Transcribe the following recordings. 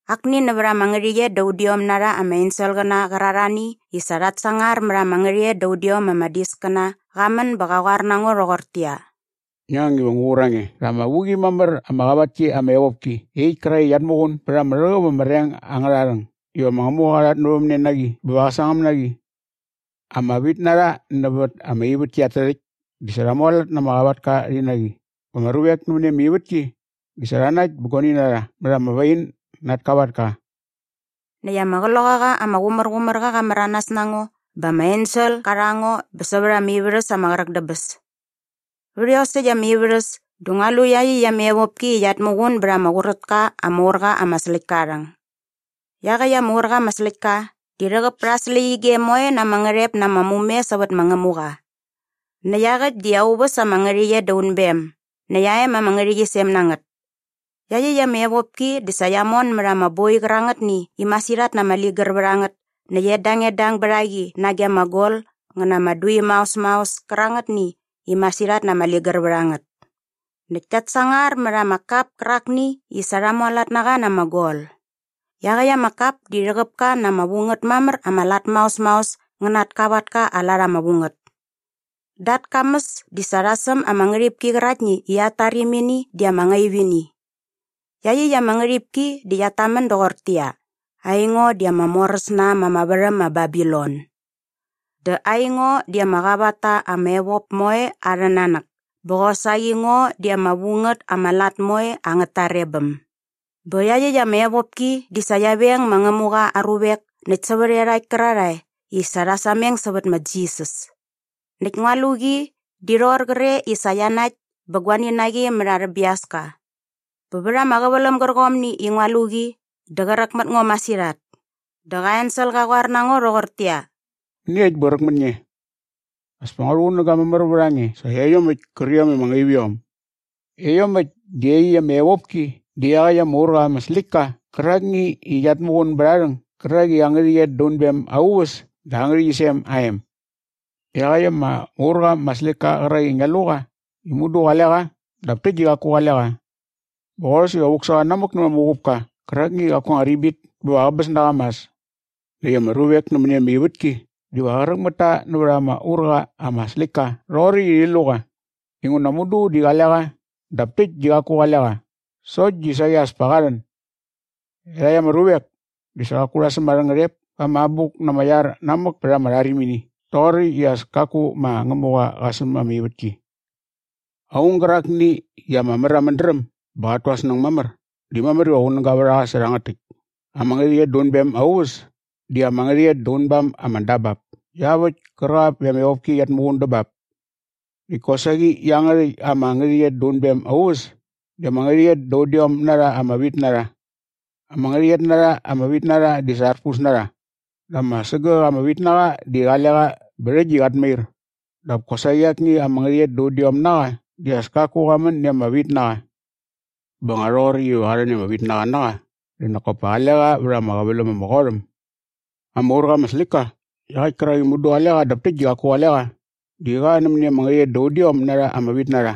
Akni nävät ama ngärhäqyet da udiom na rha ama enselqäna qärarhani i sa rhat sangar mät ama ngärhäqyet da udiom ama diskäna qa män bä qa qoar na ngo rhoqortäqyia, “Ngi ang iva ngu qur a nge rha ama vu qi mamär ama qavat ki ama evopki iaqyäkt kärakt i qiat muqun bät ama rhäqäp ama reng angärha rhäng iva ma Ngämuqa qa rhatnävämne na qi bä va qä sangäm na qi. Ama vitnarha nävät ama ivätki at tärhäkt di sa rha mualat na ama qavatka rhi na qi bä ama ruvek nämäni ama ivätki di sa rha nakt bä guani na rha mät ama wain na at kavatka.” Näkt ama Qloqaqa ama Qumärqumärqa qa märanas na ngo bä ama ensel qa rha ngo bä sävät ama ivärhäs ama qräk dä bäs. Vät iosäkt ama ivärhäs dä ngua lu iaqyäkt ama evopki i qiat muqun bät ama qurät ka ama ur qa ama släktka aa rhäng. Iaqäkt ama ur qa ama släktka di rhäqäp pät aa släqyige moe na ama ngärhep na ama mume sävät ma Ngämuqa. Näkt iaqäkt di aa uväs ama ngärhäqyet da unbem näkt aa em ama ngärhäqyisem na ngät. Iaqyäkt ama evopki di sa qia mon mät ama boi qärangätni i masirhat na ama ligär vät a ngät näkt edangedang bät a qi nage ama gol ngä na ama dui maos maos kärangätni i masirhat na ama ligär vät a ngät. Näkt kiat sangar mät ama kap kärakni i sa rha mualat na qa na ama gol. Iaqäkt ama kap di rhäqäp ka na ama vu ngät mamär ama lat maos maos ngä na at kavatka aa lat ama vu ngät. Da at kamäs di sa rha säm at ngärhipki qäraktni i at tarimini di ama ngaip ini. Iaqyäkt ama ngärhipki di qiat tamän doqortäqyia, “AINGO DI AMA MORÄS NA ÄM AMA VÄRHÄM MA BABILON. DÄ AINGO DI AMA QAVAT TA AMA EVOP MOE ARHÄ NANÄK BÄ QOSAQI NGO DI AMA VU NGÄT AMA LAT MOE ANGÄT TAREBÄM.” Bä iaqyäkt ama evopki di sa qia veng ma Ngämuqa aa ruvek näkt sävät iarhakt kärarhae i sa rha sameng sävät ma Jisas. Näkt ngua lu qi di rhoqor qre i sa qia nakt bä guani na qi mät arhä biaska. Bä vät ama qäväläm gärqomni i ngua lu qi dä qräk mät ngo masirhat. Dä qa ensel qa qoar na ngo rhoqortäqyia, “Mäniekt bä qräk mät nge? As pa ngua rhuqunäga mamär vät a nge sä iaiomäkt kärqiom i ama ngaip iom. Iaiomäkt di iaqyäkt ama evopki dä iaqäkt ama ur qa ama släktka qärakni i qiat tuqun bät aa rhäng gärak i aa ngärhäqyet da unbem aa uväs dä aa ngärhäqyisem aa em. Iaqäkt ama ur qa ama släktka qärak i ngia lu qa di mudu qale qa dap täkt di qaku qale qa. Bä qorhäs iva vuk sä qa namäk nämät ama uqupka qärakni i qaku aa anga ribit bä va qäbäs na qa mas. Näkt ama ruvek nämäni ama ivätki diva qräk mät ta nävät ama ur qa ama släktka rhoqoräkt i rhi lu qa inguna mudu di qale qa dap täkt di qaku qale qa sokt di saqi as pa qa rhän. Iarhakt ama ruvek di sa qaku rha säm arhä ngärhep pa ama abuk na ama iar namäk pät ama rharimini rhoqoräkt i as kaku ma Ngämuqa qa säm ama ivätki. “Aung gärakni i ama mär aa mädräm bä qat tu aa snäng mamär di mamär iva qunäga vät a qa sä rhangät täkt. Ama ngärhäqyet da unbem aa uväs di ama ngärhäqyet da unbam ama dabap iaväkt kärqap i ama evopki qiat muqun dä bap. Näkt kosaqi iangärhäkt ama ngärhäqyet da unbem aa uväs di ama ngärhäqyet da udiom na rha ama vitnarha. Ama ngärhäqyet na rha ama vitnarha di sa arpus na rha dap ama sägäk ama vitnaqa di qale qa bä rhäkt di qat mair dap kosaqi akni ama ngärhäqyet da udiom na qa di as kaku qa män i ama vitnaqa. Bä nga rhoqoräkt iva qa rhän i ama vitnaqa na qa dä nak kop pa qale qa vät ama qäväläm ama qot äm. “Ama ur qa ama släktka iaqäkt kärak i mudu qale qa dap täkt di qaku qale qa di qa nämäni ama ngärhäqyet da udiom na rha ama vitnarha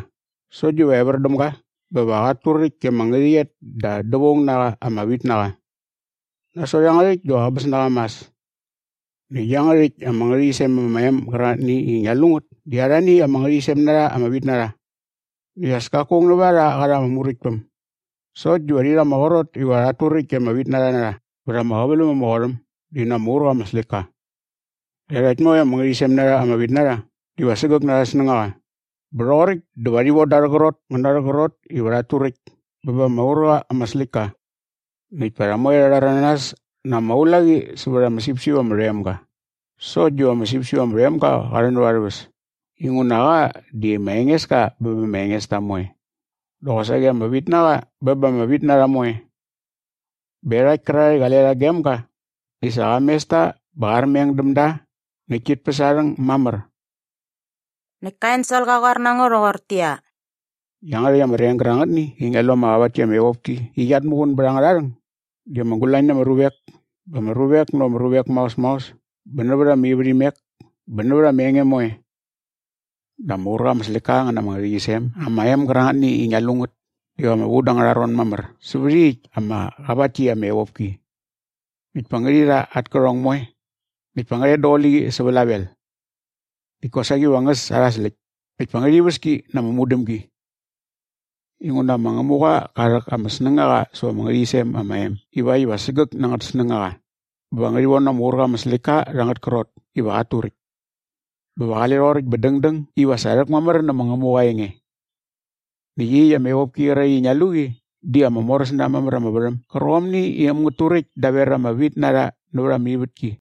sokt diva evär däm ga bä va qat turäkt i ama ngärhäqyet da dävaung na qa ama vitnaqa. Nasot iangärhäkt dä va qäbäs na qa mas. “Näkt iangärhäkt ama ngärhäqyisem ama em gärangätni i ngia lu ngät di arhani ama ngärhäqyisem na rha ama vitnarha. Näkt as kaku aung nävät a rha sa qa rha anga muräktpäm sokt diva rhi rha ama qrot iva rhat turäkt i ama vitnarha na rha vät ama qäväläm ama qot äm di na ama ur qa ama släktka. Iarhakt moe ama ngärhäqyisem na rha ama vitnarha diva sägäk na arhä snängaqa bä rhoqoräkt dä va rhi von da arhä qrot ngä na arhä qrot iva rhat turäkt bä ba ama ur qa ama släktka. Näkt pa rha moe rha rhäranas na ama ulaqi sävät ama sipsip ama rhoem ga sokt diva ama sipsip ama rhoem ga qa rhän näva arhä väs inguna qa di ma Engeska bä ba ama engesta moe dä qosaqi ama vitnaqa bä ba ama vitnarha moe. Bä iarhakt kärarhae i qale rha gem ga di sa qa mes ta bä qa armeng däm da näkt tit päs aa rhäng mamär.” Näkt ka ensel qa qoar na ngo rhoqortäqyia, “Iangärhäkt ama reng gärangätni i ngia lu ama qavat ki ama evopki i qiat muqun bät angärha rhäng di ama gulañ na ama ruvek bä ama ruvek nävät ama ruvek maos maos bä nävät ama ivärhimek bä nävät ama enge moe. Dä ama ur qa ama släktka qä na ama ngärhäqyisem ama em gärangätni i ngia lu ngät diva ama vu da angärha ron mamär sävät iaqyäkt ama qavat ki ama evopki. Näkt pa ngärhi rha at kärhong moe näkt pa ngä rhet daqule qi sä vlavel. Näkt kosaqi va ngä äs arha släkt näkt pa ngärhi väs ki na ama mudämgi. Inguna ma Ngämuqa qa rhäk ama snängaqa säva ama ngärhäqyisem ama em ivakt iva sägäk na angät snängaqa bä va ngärhi von ama ur qa ama släktka rha angät krot iva qat turäkt. Bä va qale rhoqoräkt bä dängdäng iva sa rhäkmamär nä ma Ngämuqa aa enge. “Näkt iaqyäkt ama evopki qäraktni i ngia lu qi di ama moräs na äm mamär ama värhäm gärqomni i äm ngät turäkt daver ama vitnarha nävät ama ivätki.”